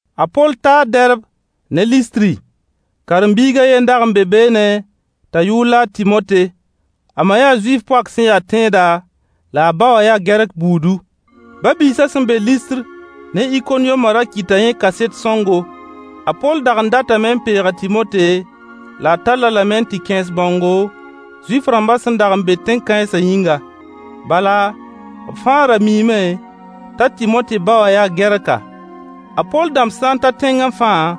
A Poll taa Dɛrb ne Listri. Karen-biig a ye n dag n be beene t'a yʋʋr la a Tɩmote. A ma yaa Zuif poak sẽn ya tẽeda, la ba wã yaa Gɛrk buudu. Ba-biisã sẽn be Listr ne Ikoniyomã ra kɩta yẽ kaset sõngo. A Poll dag n datame n peeg a Tɩmote, la tall-a lame n tɩ kẽes bãongo, Zuif-rãmbã sẽn dag n be tẽn-kãensã yĩnga. Bala, b fãa ra miime t'a Tɩmote ba wã yaa Gɛrka. A Poll dãmb sã n ta tẽngẽ fãa,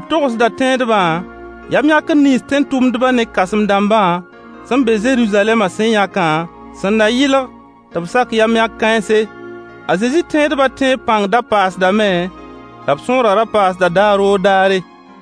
b togsda tẽedbã yam-yãkr nins tẽn-tʋmdbã ne kãsem-dãmbã sẽn be Zeruzalɛmã sẽn yãkã, sẽn na yɩlg tɩ b sak yam-yãk kãense. A Zezi tẽedba tẽeb pãng da paasdame, la b sõorã ra paasda daar o daare.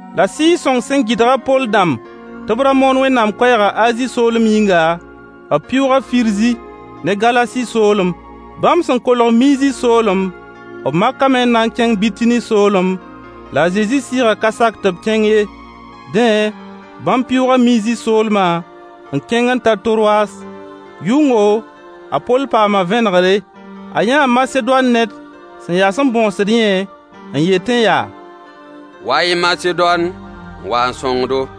La Sɩɩg-sõng sẽn gɩdg a Poll dãmb tɩ b ra moon Wẽnnaam koɛɛgã Azi soolem yĩnga, b pɩʋʋga Firzi ne Galasi soolem. Bãmb sẽn kolg Miizi soolem, b makame n na n kẽng Bitini soolem, la a Zezi Sɩɩgã ka sak tɩ b kẽng ye. Dẽ, bãmb pɩʋʋga Miizi soolmã, n kẽng n ta Torwas. Yʋngo, a Poll paama vẽnegre. A yãa Masedoan ned sẽn yas n bõosd yẽ n yetẽ yaa: Wa-y Masedoan, n wa n sõng-do.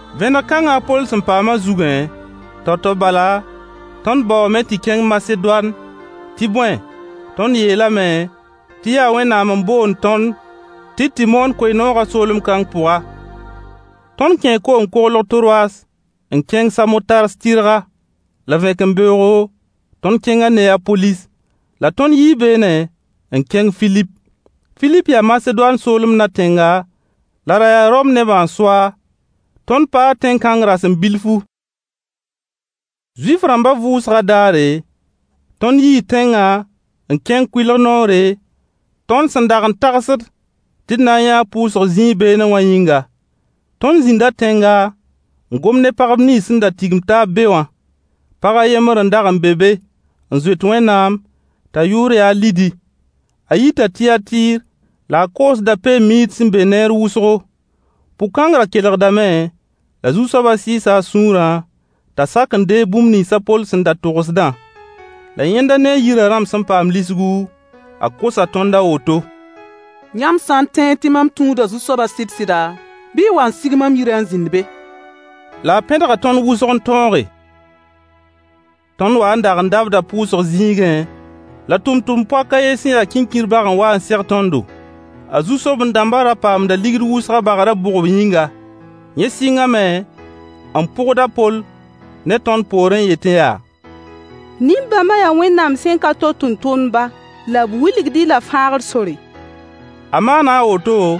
Vẽneg kãngã a Poll sẽn paamã zugẽ, tao-tao bala, tõnd baoome tɩ kẽng Masedoan. Tɩ bõe, tõnd yeela tɩ yaa Wẽnnaam n boond tõnd tɩ d tɩ moon koe-noogã soolem kãng pʋga. Tõnd kẽe koom-koglg Torwas n kẽng Samotars tɩrga. La vẽkembeoogo, tõnd kẽnga Neyapolis. La tõnd yii beene n kẽng Filip. Filip yaa Masedoan soolem na-tẽnga la ra yaa Rom nebã n so-a. Tõnd paa tẽn-kãng rasem bilfu. Zuif-rãmbã vʋʋsgã daare, tõnd yii tẽngã n kẽng kʋɩlg noore, tõnd sẽn dag n tagsd tɩ d na n yãa pʋʋsg zĩig beene wã yĩnga. Tõnd zĩnda tẽnga, n gom ne pagb nins sẽn da tigim taab be wã. Pag a yembr n dag n be be n zoet Wẽnnaam, t'a yʋʋr ya a Lidi. A yita Tiyatɩɩr, la a koosda peen-miid sẽn be neer wʋsgo. Pʋg-kãng ra kelgdame, la Zu-soabã sɩɩsa a sũurã t'a sak n deeg bũmb nins a Poll sẽn da togsdã. La yẽnda ne a yirã rãmb sẽn paam lisgu, a kosa tõnd a woto: Yãmb sã n tẽed tɩ mam tũuda Zu-soabã sɩd-sɩda, bɩ y wa n sig mam yirã n zĩnd be. La a pẽdga tõnd wʋsg n tõoge. Tõnd wa n dag n dabda pʋʋsg zĩigẽ, la tʋmtʋmd-poak a yen sẽn ya kĩnkir bag n wa n seg tõndo. A zu-soben-dãmbã ra paamda ligd wʋsg a bagrã bʋgb yĩnga. Yẽ sɩngame n pʋgd a Poll ne tõnd poor n yetẽ yaa: Nin-bãmba yaa Wẽnnaam sẽn-ka-to tʋmtʋmdba, la b wilgd-y la fãagr sore. A maana a woto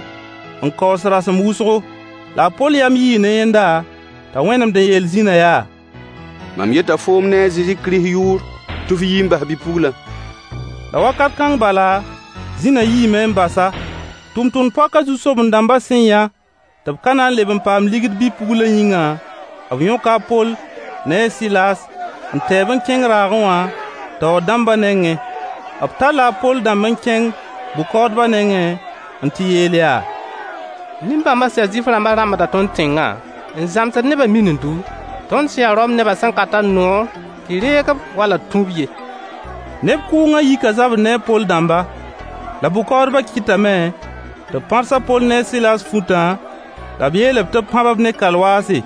n kaoos rasem wʋsgo. La a Poll yam yii ne yẽnda t'a wẽnemd n yeel zĩna yaa: Mam yeta foom ne a Zezi Kirist yʋʋre tɩ f yi n bas bi-puglã. La wakat kãng bala, zĩna yiime n bas-a. Tʋmtʋmd-poakã zu-soben-dãmbã sẽn yã tɩ b ka na n leb n paam ligd bi-puglã yĩnga, b yõka a Poll ne a Sɩlaas n tɛ-b n kẽng raagẽ wã, taoor dãmbã nengẽ. B talla a Poll dãmb n kẽng bʋ-kaoodba nengẽ n tɩ yeel yaa: Nin-bãmba sẽn ya Zuif-rãmbã rãmbda tõnd tẽngã, n zãmsd nebã minindu, tõnd sẽn ya Rome nebã sẽn ka tar noor tɩ reeg-b wall d tũ-b ye. Neb kʋʋngã yika zabr ne a Poll dãmba. La bʋ-kaoodbã kɩtame tɩ b pãrs a Poll ne a Sɩlaas futã la b yeel tɩ b pãb-b ne kalwaase.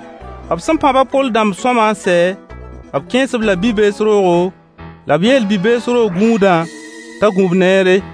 B sẽn pãb a Poll dãmb sõama n sɛ, b kẽes-b-la bi-bees roogo, la b yeel bi-bees roog gũudã t'a gũ-b neere.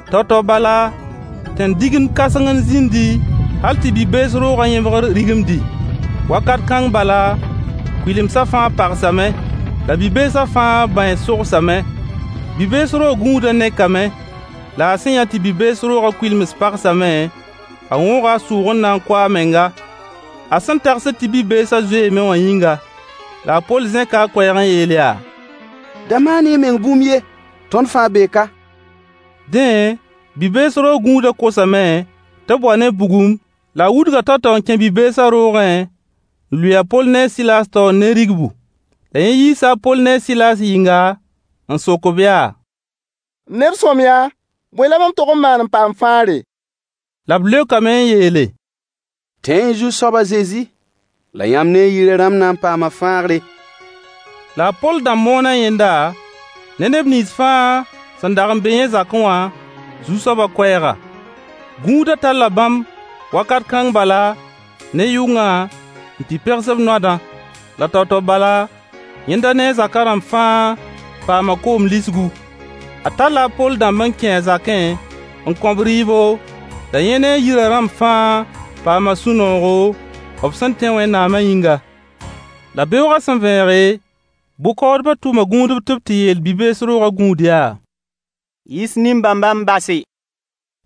Tao-tao bala, tẽn-digemd kãseng n zĩndi, hal tɩ bi-bees roogã yẽbgr rigimdi. Wakat kãng bala, kʋɩlemsã fãa pagsame, la bi-beesã fãa bãens sogsame. Bi-bees roog gũuda nekame. La a sẽn yã tɩ bi-bees roogã kʋɩlems pagsame, a wõoga a sʋʋg n na n kʋ a menga, a sẽn tagsd tɩ bi-beesã zoeeme wã yĩnga. La a Poll zẽka a koɛɛg n yeel yaa: Da maan-y y meng bũmb ye! Tõnd fãa bee ka. Dẽ, bi-bees roog gũudã kosame tɩ b wa ne bugum, la a wudga tao-tao n kẽ bi-beesã roogẽ, n lʋɩ a Poll ne a Sɩlaas taoor ne rigbu. La yẽ yiisa a Poll ne a Sɩlaas yɩnga, n sok-b yaa: M neb sõamyã, bõe la mam tog n maan n paam fãagre? La b leokame n yeele: Tẽ-y Zu-soab a Zezi, la yãmb ne y yirã rãmb na n paama fãagre. La a Poll dãmb moona yẽnda ne neb nins fãa sẽn dag n be yẽ zakẽ wã Zu-soabã koɛɛga. Gũudã talla bãmb wakat kãng bala, ne yʋngã, n tɩ pegs b noadã. La tao-tao bala, yẽnda ne a zaka rãmb fãa paama koom lisgu. A talla a Poll dãmb n kẽ a zakẽ, n kõ-b rɩɩbo, la yẽ ne a yirã rãmb fãa paama sũ-noogo, b sẽn tẽ Wẽnnaamã yĩnga. La beoog sẽn vẽege, bʋ-kaoodbã tʋma gũudb tɩ b tɩ yeel bi-bees roogã gũud yaa: yiis nin-bãmbã n base.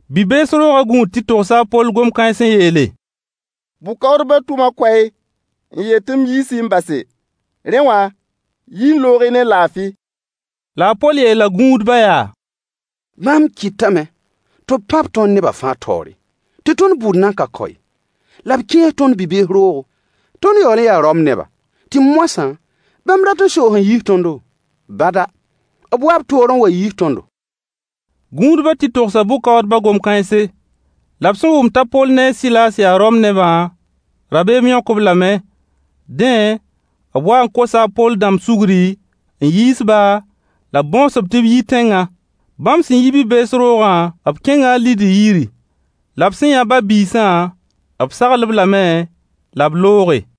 Bi-bees roogã gũud tɩ togsa a Poll gom kãens n yeele: Bʋ-kaoodbã tʋma koɛɛg n yeel tɩ m yiis-y n base. Rẽ wã, yi-y n loog-y ne laafɩ. La a Poll yeela gũudbã yaa: Bãmb kɩtame tɩ b pãb tõnd neba fãa taoore, tɩ tõnd bʋʋd nan ka kao ye, la b kẽes tõnd bi-bees roogo. Tõnd yaool n yaa Rom neba. Tɩ moasã, bãmb rat n soos n yiis tõndo? Bada! B wa b toor n wa n yiis tõndo. Gũudbã tɩ togsa bʋ-kaoodbã gom kãense. La b sẽn wʋm t'a Poll ne a Sɩlaas yaa Rom nebã, rabeem yõk-b lame. Dẽ, b waa n kosa a Poll dãmb sugri, n yiis-ba, la b bõos-b tɩ b yi tẽngã. Bãmb sẽn yi bi-bees roogã, b kẽnga a Lidi yiri. La b sẽn yã ba-biisã, b sagl-b lame la b looge.